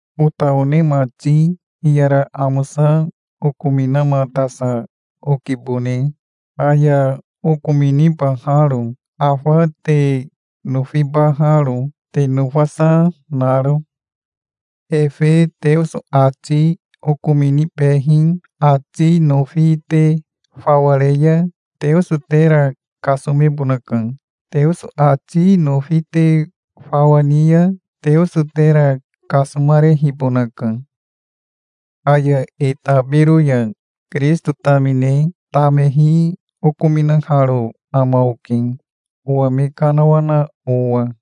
Ota one mati, hiyara amosa okominamatasa okibone, aya okominibaharo, afa te nofibaharo, te nofasa naro. Efe Teoso ati okominibehi ati nofi te fawa re ya Teoso tera kasomebonaka. Teoso ati nofi te fawa ni ya Teoso tera kasomarehibonaka. Aya e tabiro ya Kirisito tamine tamehi okominaharo ama oke, owa me kanawana owa.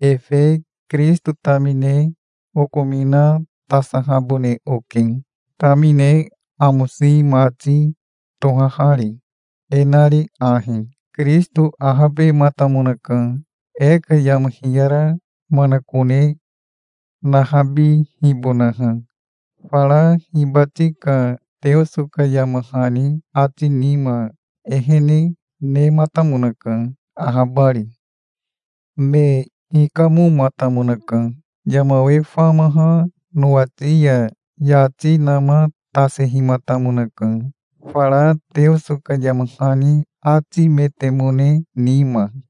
Efe Kirisito tamine okominatasahabone oke, tamine amosi mati tohahari, e nari ahi: Kirisito ahabematamonaka, e ka yama hiyara manakone nahabihibonaha. Fara hibati ka Teoso ka yama hani ati nima ehene nematamonaka, ahabari. Me hikamomatamonaka. Yama we famaha nowati ya yati namatasehimatamonaka, fara Teoso ka yama hani atimetemone nima.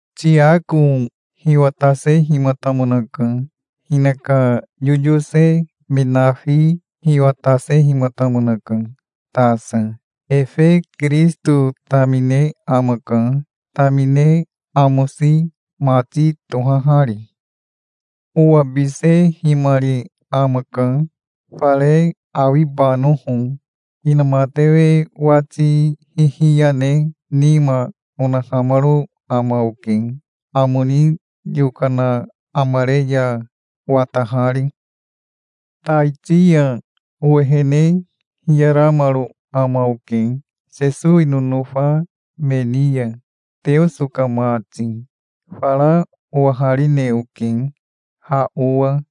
Tiako hiwatasehimatamonaka. Hinaka yoyose me nafi hiwatasehimatamonaka tasa. Efe Kirisito tamine amaka, tamine amosi mati tohahari. Owabisehimari amaka, fare awibanoho. Inamatewe wati hihiya ne nima onahamaro ama oke, amo ni yokana amare ya watahari. Taiti ya owehene hiyaramaro ama oke Sesowi nonofa me ni ya, Teoso ka mati. Fara owaharine oke ha owa,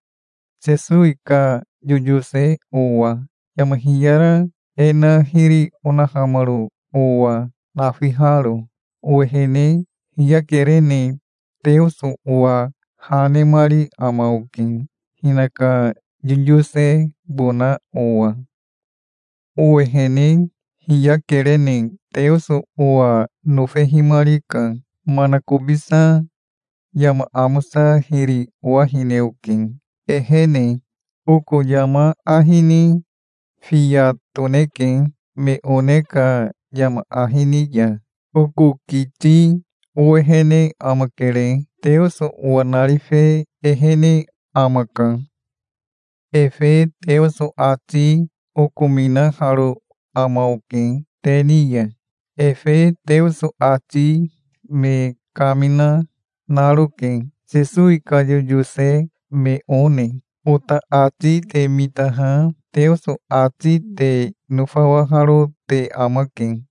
Sesowi ka yoyose owa, yama hiyara e na hiri onahamaro owa nafiharo. Owehene hiyakerene Teoso owa ha nemari ama oke hinaka yoyosebona owa. Owehene hiyakerene Teoso owa nofehimarika. Manakobisa yama amosa hiri owahine oke, ehene. Oko yama ahi ni fiya toneke, me one ka yama ahi ni ya. Oko kiti owehene amakere. Teoso owa narife ehene amaka. Efe Teoso ati okominaharo ama oke te ni ya. Efe Teoso ati me kamina, naroke, Sesowi ka yoyose me one. Ota ati te mitaha Teoso ati te nofawaharo te amake.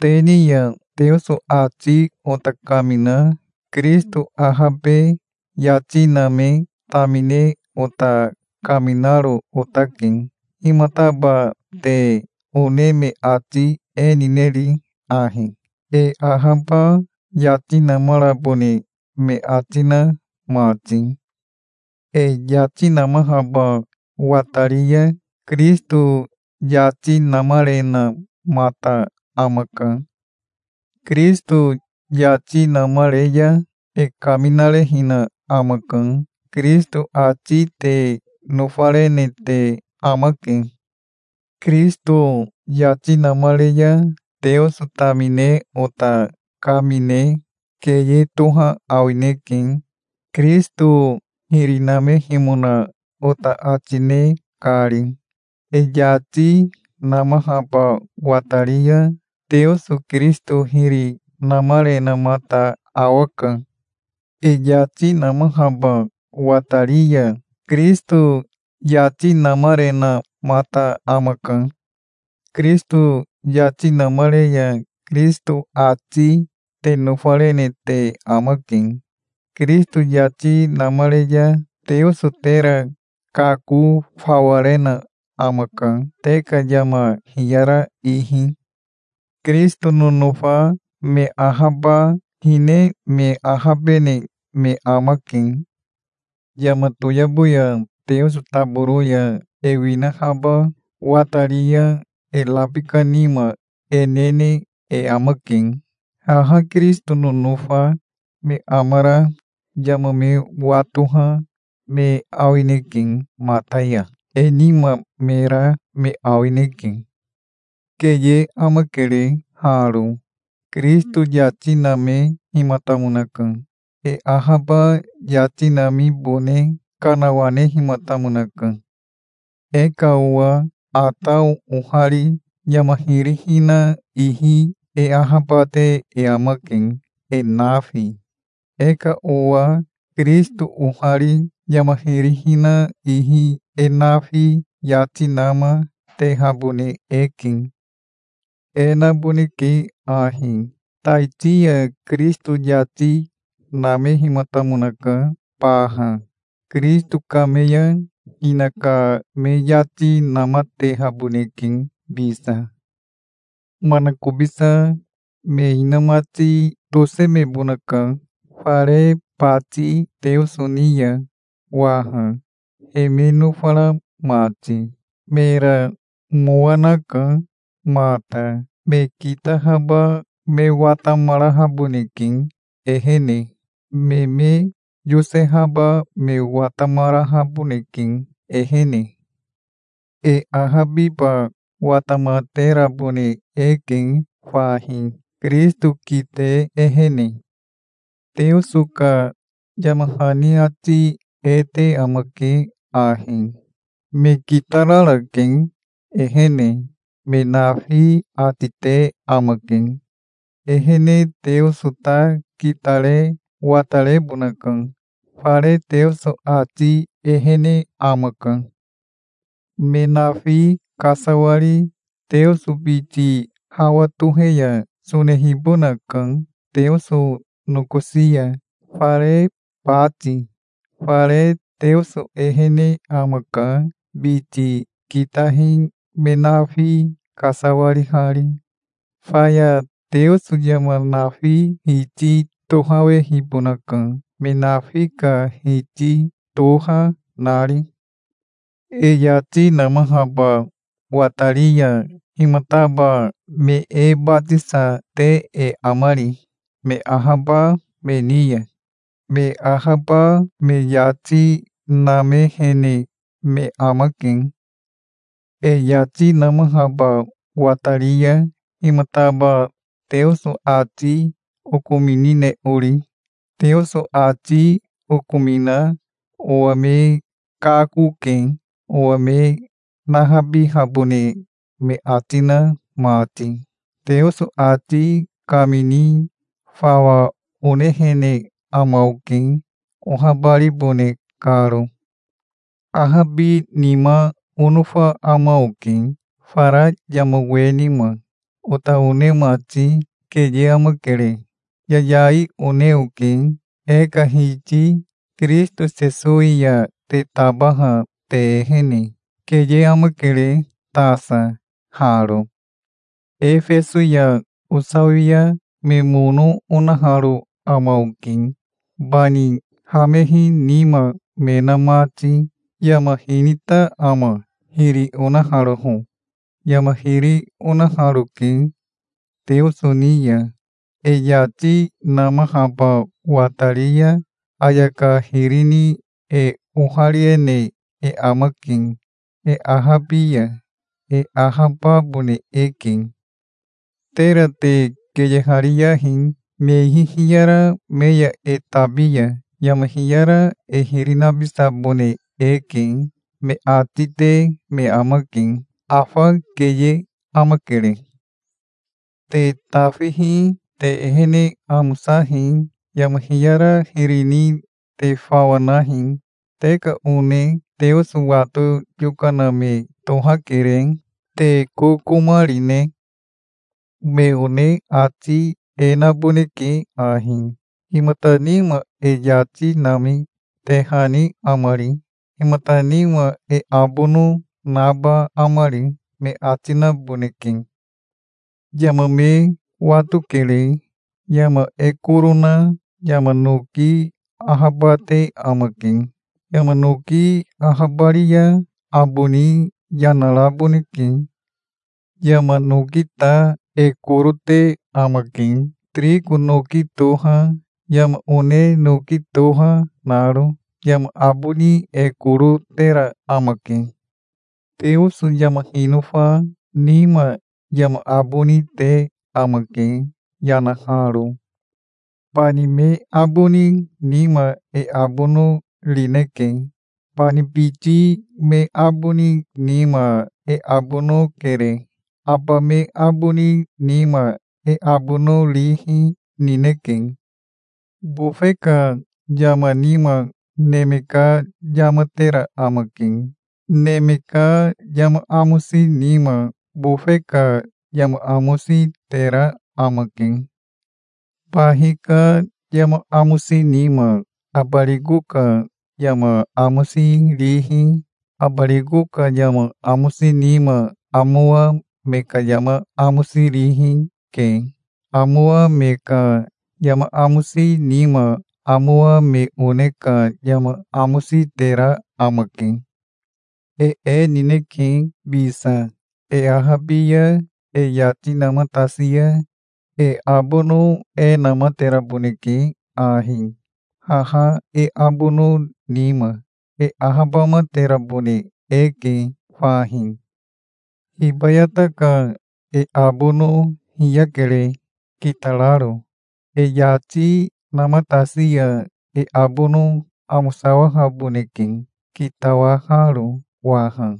Te ni ya Teoso ati ota kamina Kirisito ahabe yati name tamine ota kaminaro otake. Himataba te one me ati e nineri ahi, e ahaba yati namarabone me ati na mati? E yati namahaba watari ya Kirisito yati namarenamata amaka. Kirisito yati namare ya e kaminarehina amaka. Kirisito ati te nofarene te amake. Kirisito yati namare ya Teoso tamine ota kamine keye toha awineke, Kirisito hiri namehimona ota ati ne kari. E yati namahaba watari ya Teoso Kirisito hiri namarenamata awaka. E yati namahaba watari ya Kirisito yati namarenamata amaka. Kirisito yati namare ya Kirisito ati te nofarene te amake. Kirisito yati namare ya Teoso tera kako fawa rena amaka, te ka yama hiyara ihi. Kirisito nonofa me ahaba hine me ahabene me amake. Yama toyabo ya Teoso taboro ya e winahaba watari ya e rabika nima e nene e amake. Haha Kirisito nonofa me amara yama me watoha me awineke mata ya. E nima me ra me awineke. Keye amakere haro. Kirisito yati namehimatamonaka. E ahaba yati namibone kanawanehimatamonaka. E ka owa Atao ohari yama hiri hina ihi e ahabate e amake, e nafi. E ka owa Kirisito ohari yama hiri hina ihi e nafi yati nama, tehabone eke. E naboneke ahi: Taiti ya Kirisito yati namehimatamonaka baha. Kirisito kame ya hinaka me yati namatehaboneke bisa. Manakobisa me inamati tosemebonaka fare bati Teoso ni ya waha, he me nofara mati. Mera mowa naka mata. Me kitahaba me watamarahaboneke ehene. Me me yosehaba me watamarahaboneke ehene. E ahabiba watamaterabone eke fahi, Kirisito kite ehene. Teoso ka yama hani ati e te amake ahi: "Me kitararake ehene, me nafi", ati te amake. Ehene Teoso ta kitare watarebonaka. Fare Teoso ati ehene amaka. Me nafi kasawari Teoso biti hawa tohe ya sonehibonaka Teoso nokosi ya, fare bati. Fare Teoso ehene amaka, biti kitahi me nafi kasawarihari. Faya Teoso yama nafi Hiti tohawehibonaka, me nafi ka Hiti toha nari. E yati namahaba watari ya himataba me e batisa te e amari, me ahaba me ni ya? Me ahaba me yati namehene me amake. E yati namahaba watari ya himataba Teoso ati okominine ori? Teoso ati okomina owa me kakoke, owa me nahabihabone me ati na mati. Teoso ati kamini fawa onehene ama oke, ohabaribone karo. Ahabinima onofa ama oke fara yama we nima. Ota one mati, keye amakere. Yayai one oke, e ka Hiti Kirisito Sesowi ya te tabaha te ehene. Keye amakere tasa haro. Efeso ya osawi ya me mono onaharo ama oke, bani hamehi nima me na mati. Yama hinita ama, hiri onaharoho? Yama hiri onaharoke Teoso ni ya. E yati namahaba watari ya ayaka hiri ni e ohariene e amake. E ahabi ya e ahababone eke. Tera te keyehariyahi. "Me ihi hiyara me ya e tabi ya yama hiyara e hiri nabisabone eke", me ati te me amake. Afa keye amakere. Te tafihi. Te ehene amosahi. Yama hiyara hiri ni te fawa nahi. Te ka one Teoso wato yokana me tohakere. Te kokoma rine? Me one ati e naboneke ahi: "Himata nima e yati nami tehani amari? Himata nima e abono naba amari?" me ati naboneke. Yama me watokere. Yama e koro na yama noki ahabate amake. Yama noki ahabari ya aboni yanaraboneke. Yama noki ta e koro te amake, tiriko noki toha, yama one noki toha naro. Yama aboni e koro tera amake. Teoso yama hinofa nima yama aboni te amake, yanaharo. Bani me aboni nima e abono rineke. Bani biti me aboni nima e abono kere. Aba me aboni nima e abono rihi nineke. Bofe ka yama nima neme ka yama tera amake. Neme ka yama amosi nima bofe ka yama amosi tera amake. Bahi ka yama amosi nima abariko ka yama amosi rihi, abariko ka yama amosi nima amowa me ka yama amosi rihi, ke. Amowa me ka yama amosi nima amowa me one ka yama amosi tera amake. E e nineke bisa. E ahabi ya e yati namatasi ya e abono e namateraboneke ahi, haha e abono nima. E ahabamaterabone eke fahi. Hibayata ka e abono hiyakere, kitararo. E yati namatasi ya e abono amosawahaboneke, kitawaharo waha.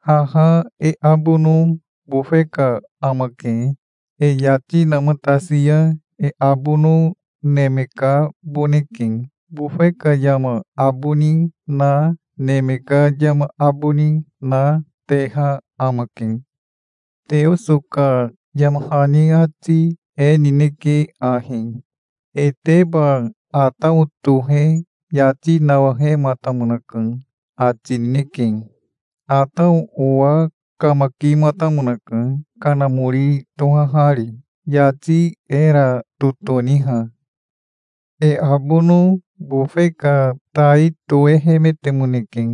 Haha e abono bofe ka amake. E yati namatasi ya e abono neme kaboneke. Bofe ka yama aboni na, neme ka yama aboni na, teha amake. Teoso ka yama hani ati e nineke ahi: "Eteba Atao tohe yati nawahematamonaka", ati nineke. Atao owa kamakimatamonaka, kanamori tohahari, yati era totoniha. E abono bofe ka tai toehemetemoneke.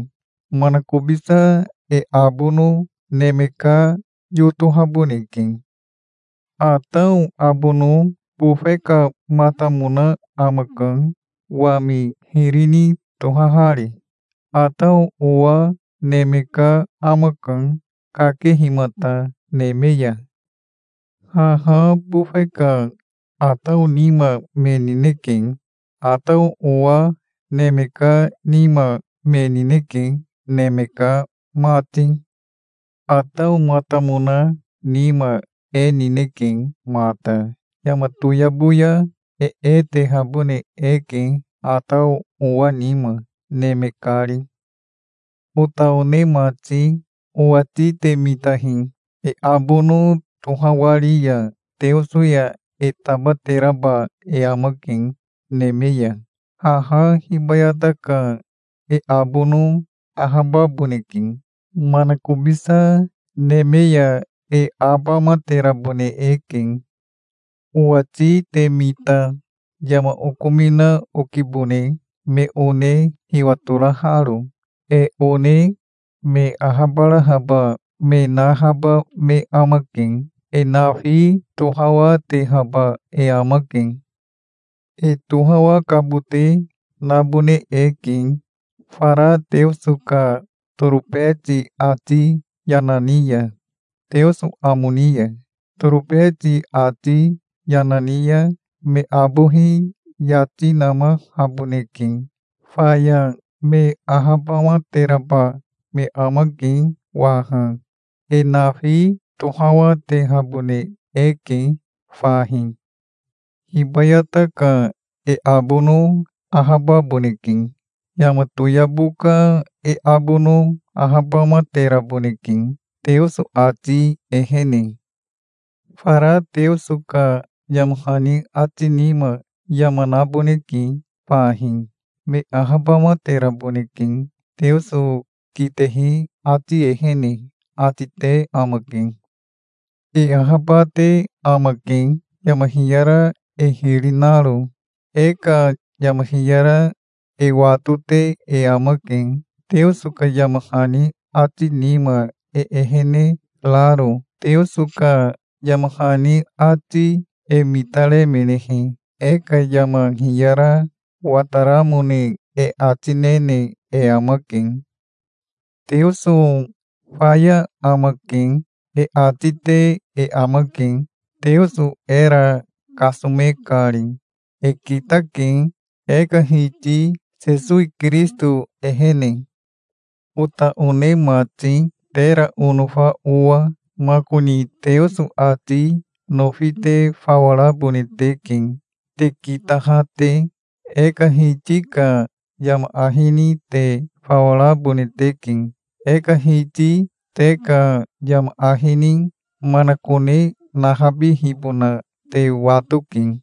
Manakobisa e abono neme ka yotohaboneke. Atao abono bofe kamatamona amaka, wami hiri ni tohahari. Atao owa neme ka amaka, kakehimata neme ya. Haha bofe ka Atao nima me nineke. Atao owa neme ka nima me nineke, neme ka mati. Ataomatamona nima e nineke mata. Yama toyabo ya e e tehabone eke Atao owa nima, neme kari. Ota one mati, owati te mitahi. E abono tohawari ya Teoso ya e tabateraba e amake neme ya. Haha hibayata ka e abono ahababoneke. Manakobisa neme ya e abamaterabone eke. Owati te mita. Yama okomina okibone, me one hiwatoraharo. E one me ahabarahaba me nahaba me amake. E nafi tohawatehaba e amake. E tohawakabote nabone eke, fara Teoso ka torobeti ati yana ni ya, Teoso amo ni ya. Torobeti ati yana ni ya me abohi yati namahaboneke. Faya me ahabamateraba me amake waha. E nafi tohawatehabone eke fahi. Hibayata ka e abono ahababoneke. Yama toyabo ka e abono ahabamateraboneke, Teoso ati ehene. Fara Teoso ka yama hani ati nima yama naboneke fahi. "Me ahabamateraboneke Teoso kitehi ati ehene", ati te amake. E ahabate amake, yama hiyara e hiri naro. E ka yama hiyara e watote e amake, Teoso ka yama hani ati nima e ehene raro. Teoso ka yama hani ati e mitaremenehe e ka yama hiyara wataramone e ati nene e amake. "Teoso faya amake", e ati te e amake, Teoso era kasome kari. E kitake, e ka Hiti Sesowi Kirisito ehene. Ota one mati, tera onofa owa, makoni Teoso ati nofi te fawa rabone teke, te kitaha te. E ka Hiti ka yama ahi ni te fawa rabone teke. E ka Hiti te ka yama ahi ni manakone nahabihibona te watoke.